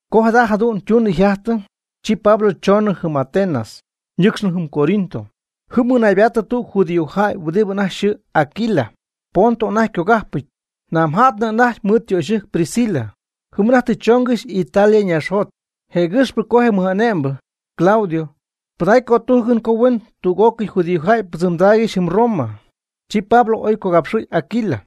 Co jada jadu'n ytunɨ yjajtɨ, chi Pablo choonɨ jɨm Atenas, ñɨcxɨ jɨm Corinto. Jɨm mɨnaybaatɨ tüg judíojäy huɨdi anajty yxɨɨ Aquila, Ponto anajty ycogajpɨty, namja'tnɨ anajty mɨɨd ytöxyɨjc Priscila. Jɨm anajty tɨ chongɨxy Italia ñaaxjot, jëgɨxpɨ co je mɨj'ane'mbɨ, Claudio, pɨdacy cötujcɨn co huen tüg'ócɨy judíojäy pɨdzɨmdaaygɨxy jɨm Roma. Chi Pablo oy cogapxɨ̈y Aquila.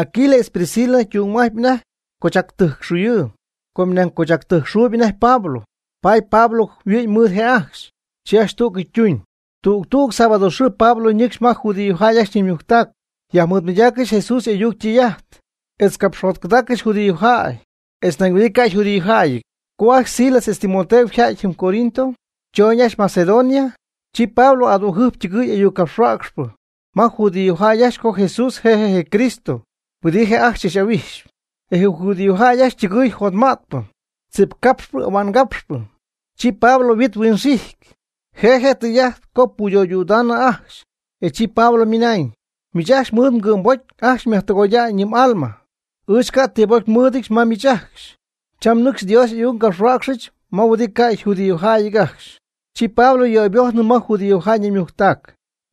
Aquila etz Priscila ytung'ajtpy anajty cochactɨjcxuyɨɨ, com nañ cochactɨjcxuuyb anajty Pablo, paady Pablo jɨm yhuɨ'my mɨɨd je' ajcxy. Chi ajcxy tú'cɨy ytuuñ. Tüg tüg sábado xɨɨ Pablo ñɨcxy ma je judíojäy ajcxy ñaymujctac yajmɨɨdmɨydaaccɨxy Jesús y'ayuc ytɨy'ajt etz capxjotcɨdaaccɨxy judíojäy etz nañ huɨdi ca' yjudíojäyɨty. Co ajcxy Silas etz Timoteo yja'ty jɨm Corinto, chooñ ajcxy Macedonia, chi Pablo adügjɨjp ytɨgɨɨy ayuccapxhuäcxpɨ ma judíojäy ajcxy co Jesús je' je' je Cristo huɨdi je' ajcxy chach'ahuijxyp. E je judíojäy ajcxy ytɨgɨɨy jotma'tpɨ, tzipcapxpɨ ahua'ngapxpɨ. Chi Pablo yhuit huinxijty, je' je' je tɨy'ajt co puyöydüdaanɨ ajcxy, e chi Pablo ymɨnañ: ―Miich ajcxy mɨɨd mgɨ'mbocy ajcxy myajtɨgoya'ñ yɨ m'alma. Ɨɨch ca' ti pocy nmɨ́ɨdɨdyɨch ma miich ajcxy. Cham nɨcxy Dios y'ayuc ngapxhuäcxɨch ma huɨdi ca' yjudíojäyɨty ajcxy. Chi Pablo yöybojtnɨ ma judíojäy naymujctac,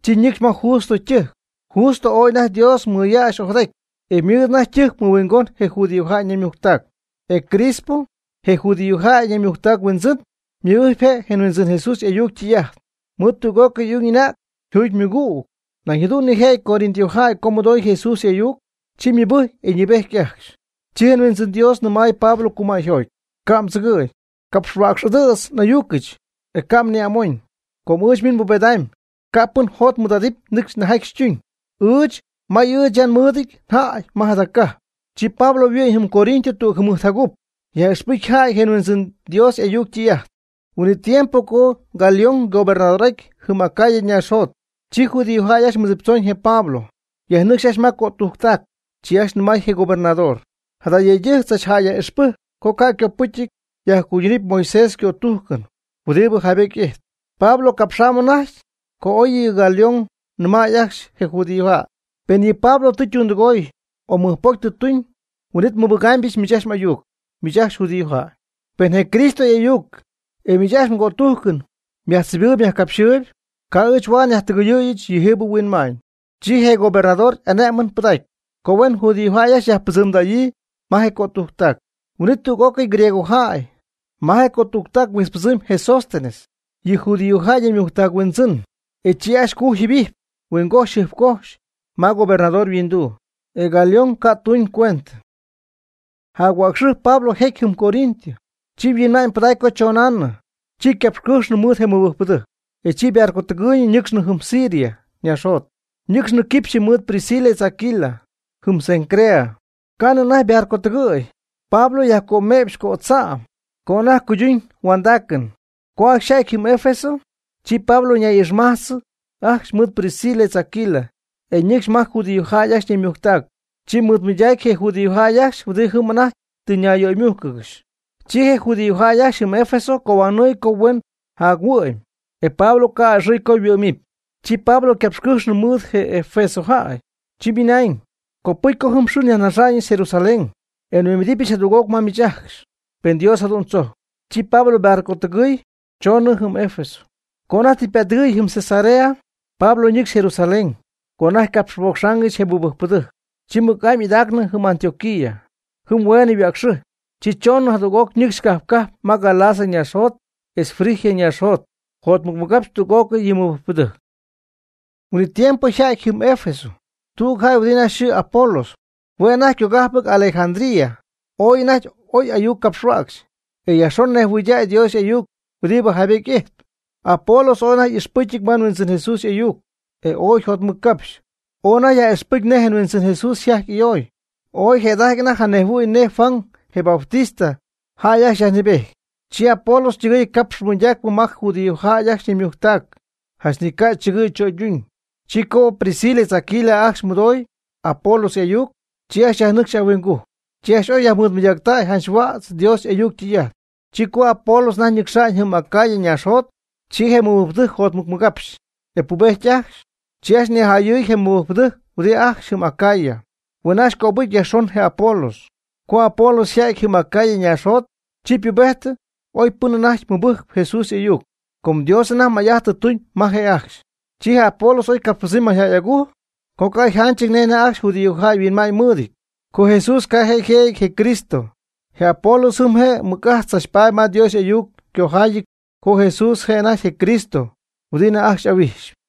chi ñɨcxy ma Justo ytɨjc. Justo ooy anajty Dios mɨyäxy ojadaty, e ymɨɨd anajty ytɨjc mɨhuingon je judíojäy ñaymujctac. E Crispo, je judíojäy ñaymujctac huindzɨn, ymɨbɨjc je' je Huindzɨn Jesús y'ayuc ytɨy'ajt, mɨɨd tüg'ócɨy y'ung y'anäg, yjuugy ymɨgüg. Nañ jadu'n nijëjɨty Corinto jäy co mɨdoy Jesús y'ayuc, chi mɨbɨjcy e ñɨɨbejty ajcxy. Chi je Huindzɨn Dios nɨmay Pablo cumäyjoty: ―Ca' mdzɨgɨ̈, capxhuäcx'adɨ̈tz n'ayucɨch, e ca' mni'amoñ. Com ɨɨch miich nbubedɨpy, ca' pɨn jot mɨɨd'adɨpy nɨcxy nejjaty xytuñy. Ɨɨch may ɨɨch ya nmɨɨdɨty jäy ma jada cajp. Chi Pablo yhuɨ'my jɨm Corinto tüg jɨmɨjt jacup, yaj'ixpɨjcy jäy je Huindzɨn Dios y'ayuc ytɨy'ajt. Huin'it tiempo co Galión ygobernador'ajty jɨm Acaya ñaaxjot, chi judíojäy ajcxy mɨdziptzoñ je Pablo, yajnɨcxy ajcxy ma cötujctac. Chi ajcxy nɨmay je gobernador: ―Jada yëydɨjc tzach jäy yaj'ixpɨjcp co ca' ycopɨcyɨty yajcuydunɨpy Moisés ycötujcɨn huɨdi jaybety ijtp. Pablo capxamb anajty co oy yɨ Galión nɨmäy ajcxy je judíojäy: ―Pen yɨ Pablo tɨ ytundɨgooy o mɨjpocy tɨ tuñ, huin'it nmɨjpɨdägɨbɨch miich ajcxy m'ayuc, miich ajcxy judíojäy. Pen je Cristo y'ayuc etz miich ajcxy mgötujcɨn myajtzibɨɨyb myajcapxyɨɨyb, ca' ɨɨch huaad nyajtɨgɨyɨ̈yɨch yɨjiibɨ huinma'ñ. Chi je gobernador y'ané'mɨn pɨdacy co huen judíojäy ajcxy yajpɨdzɨmdäyii ma je cötujctac. Huin'it tüg'ócɨy griegojäy ma je cötujctac huijtzpɨdzɨɨmyb je Sóstenes, yɨ judíojäy naymujctac huindzɨn, e chi ajcxy cujy jɨbijpy huingojxy jɨjpcojxy ma gobernador yhuinduu, e Galión ca' tuñycuentɨ. Jac-huäcxɨjp Pablo jecy jɨm Corinto. Chi yhuinma'ñypɨdacy co chonaanɨ. Chi ycapxycɨjxnɨ mɨɨd je mɨbɨjcpɨdɨjc, e chi ybarcotɨgɨɨyñɨ ñɨcxnɨ jɨm Siria ñaaxjot. Ñɨcxnɨ quipxyɨ mɨɨd Priscila etz Aquila. Jɨm Cencrea, ca'nɨ anajty ybarcotɨgɨɨyɨ, Pablo yajcöme'px cödza'm co anajty cuyduñ yhuandaacɨn. Co ajcxy yja'ty jɨm Efeso, chi Pablo ñay'ixmajtz ajcxy mɨɨd Priscila etz Aquila, e ñɨcxy ma je judíojäy ajcxy ñaymujctac. Chi mɨɨdmɨydacy je judíojäy ajcxy huɨdi jɨm anajty tɨ ñayyöymújcɨgɨxy. Chi je judíojäy ajcxy jɨm Efeso cohuanɨɨy co huen jac-huɨ'my, e Pablo ca' a'ɨxɨɨy co yhuɨ'mɨpy. Chi Pablo ycapxycɨjxnɨ mɨɨd je Efeso jäy, chi ymɨnañ: ―Copɨcy co jɨm xɨɨ nyajnaxa'ñyɨch Jerusalén, e nhuimbidɨpyɨch jadüg'oc ma miich ajcxy, pen Dios jadu'n tzojcp. Chi Pablo ybarcotɨgɨɨy choonɨ jɨm Efeso. Co anajty tɨ ypättɨgɨ̈y jɨm Cesarea, Pablo nɨcxy Jerusalén co anajty capxpocxaangɨxy je mɨbɨjcpɨdɨjc, chi mɨc'amy idaacnɨ jɨm Antioquía. Jɨm hueenɨ yhuäcxɨjpy, chi choñ jadüg'oc ñɨcxy cajp cajp ma Galacia ñaaxjot etz Frigia ñaaxjot jotmɨcmɨgapxcɨxy tüg'ócɨy yɨ mɨbɨjcpɨdɨjc. Huin'it tiempo yja'ty jɨm Efeso tüg jäy huɨdi anajty yxɨɨ Apolos, hue' anajty ycogájpɨty Alejandría. Ooy anajty oy ayuc capxhuäcxy. E yajxon nejhuɨydäy Dios y'ayuc huɨdi jaybety ijtp. Apolos ooy anajty ixpɨcyɨty ma Huindzɨn Jesús y'ayuc e ooy yjotmɨccapxy, oy anajty yaj'ixpɨcy nej je Huindzɨn Jesús yjajty y'ayoy. Oy jëda'ajty anajty janejhuɨ̈y nej Juan, je Bautista, jäy ajcxy yajnɨɨbejty. Chi Apolos ytɨgɨɨy capxpɨ mɨydaacpɨ ma je judíojäy ajcxy ñaymujctac janch ni ca' chɨgɨ̈y chöyduñ. Chi co Priscila etz Aquila ajcxy mɨdooy Apolos y'ayuc, chi ajcxy yajnɨcxy ahuingujc, chi ajcxy oy yajmɨɨdmɨydägy jac-huädz Dios y'ayuc ytɨy'ajt. Chi co Apolos anajty ñɨcxa'ñ jɨm Acaya ñaaxjot, chi je mɨbɨjcpɨdɨjc jotmɨcmɨgapxy, e pubejty ajcxy. Chi ajcxy nijayɨɨy je mɨbɨjcpɨdɨjc huɨdi ajcxy jɨm Acaya, huen ajcxy cöbɨgɨpy yajxon je Apolos. Co Apolos yja'ty jɨm Acaya ñaaxjot, chi ypubejtɨ ooy pɨn anajty mɨbɨjcp Jesús y'ayuc, com Dios anajty may'ajt tɨ tuñ ma je' ajcxy. Chi je Apolos oy capxpɨdzɨmy mayjäy agujc co ca' yjanchɨty nej anajty ajcxy judíojäy yhuinma'ñ mɨɨdɨty, co Jesús ca' je' yjëjɨty je Cristo. Je Apolos jɨm je' mɨc'ajt tzachpaady ma Dios y'ayuc ycojaayɨty co Jesús je' je' anajty je Cristo huɨdi anajty ajcxy y'ahuijxyp.